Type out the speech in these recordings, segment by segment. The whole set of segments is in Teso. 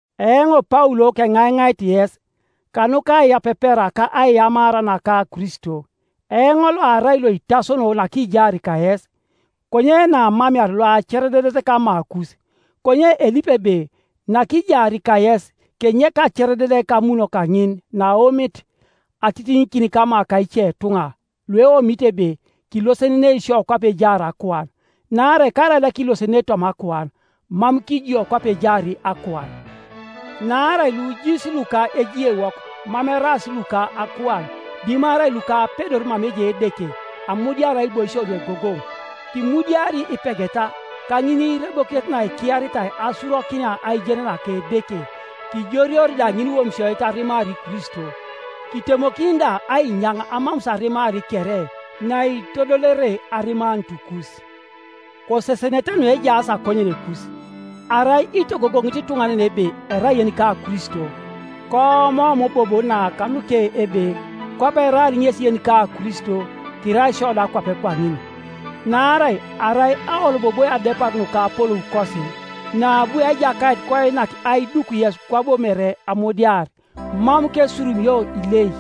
Eoŋ Paul keŋaiŋait yes, kanuka aiyapepera ka aiyamara naka Kristo, eoŋ loarai loitasono nakijaar kayes, konye naamamear loacerededet kamakus, konye elipi ebe nakijaar kayes kenyek aeereded kamuno kaŋin naaomit atitiŋikin kama ka icetuŋa lueomito ebe kilosenenei isio kwape ejaar akuan. Naarai karaida kilosenenei toma akuan, mam kijio kwape ejaar akuan, naarai lujiis luka ejiewok mam eraas luka akuan, dimarai luka apedor mama ejai Edeke, amudiar aiboisio nuegogoŋ, Kimudiari ipegeta, ka ŋiniirebokinet naikiaritai asurokinia aijen naka Edeke, kijoreori da ŋiniwomisioit arimar Kristo, kitemokin da ainyaŋ amamus arimar kere, naitodolere arimanutukus. Kosesenete nuejaas akonyenekus, Arai itogogoŋit ituŋanan ebe erai yenika Kristo, koomoom bobo na kanuke ebe, kwape eraar ŋesi yenika Kristo, kirai isio da kwape kwaŋin. Naarai arai aoloboboi adepar nuka apoloukosi, naabu Ejakait koinak aiduk yes kwabo mere amudiar, mam kesurumio ilek.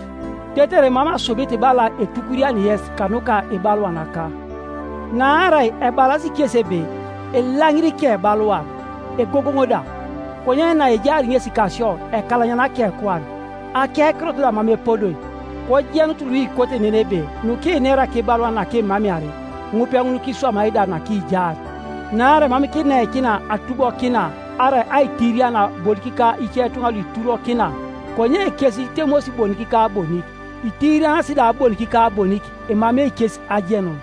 Tetere mam asubit bala etukuriani yes kanuka ibaluanaka. Naarai ebalasi kesi ebe, “Elaŋir ikebaluan, egogoŋ da, konye naejaar ŋesi kasio ekalanyana akekuan, akekirot da mam epodoi.” Kojenut luikote nen ebe nukinera kibaluan nakimamear, ŋupeŋun kiswamai da nakijaar. Naarai mam kineikina atubokina arai aitiriana bonik ka icetuŋa luiturokina, Konye kes itemos bonik ka bonik, itirianas da bonik ka bonik, emamei kes ajenun.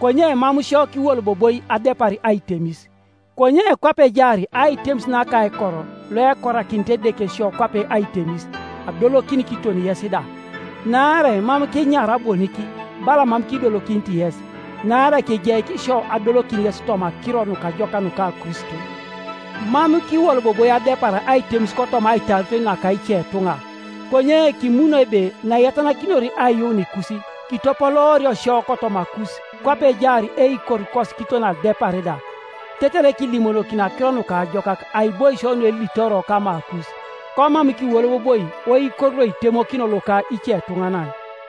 Konye mam sio kiwoloboboi adepar aitemis, konye kwape ejaar aitemis naka aikor loekorakinit Edeke sio kwape aitemis, adolokin kiton yes da, Naarai mam kinyaara bonik, bala mam kidolokinit yes; naarai kigeik isio adolokin yes toma Akiro Nukajokak nuka Kristo. Mam kiwoloboboi adepar aitemis kotoma aitaaritoi naka icetuŋa; konye kimuno ebe naiyatanakinor aiyuunikus, kitopoloorio sio kotomakus kwape ejaar eikorukos kiton adepar da, tetere kilimonokini Akiro Nukajokak aiboisio nuelitoro kamakus, komam kiwoloboboi oikor loitemokino loka icetuŋanan.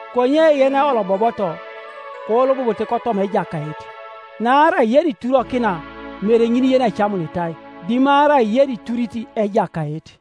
Konye “Yeneolobobot, koolobobote kotoma Ejakait.” Naarai yeniturokina, mere ŋin yenecamunitai, dimarai yeniturit Ejakait.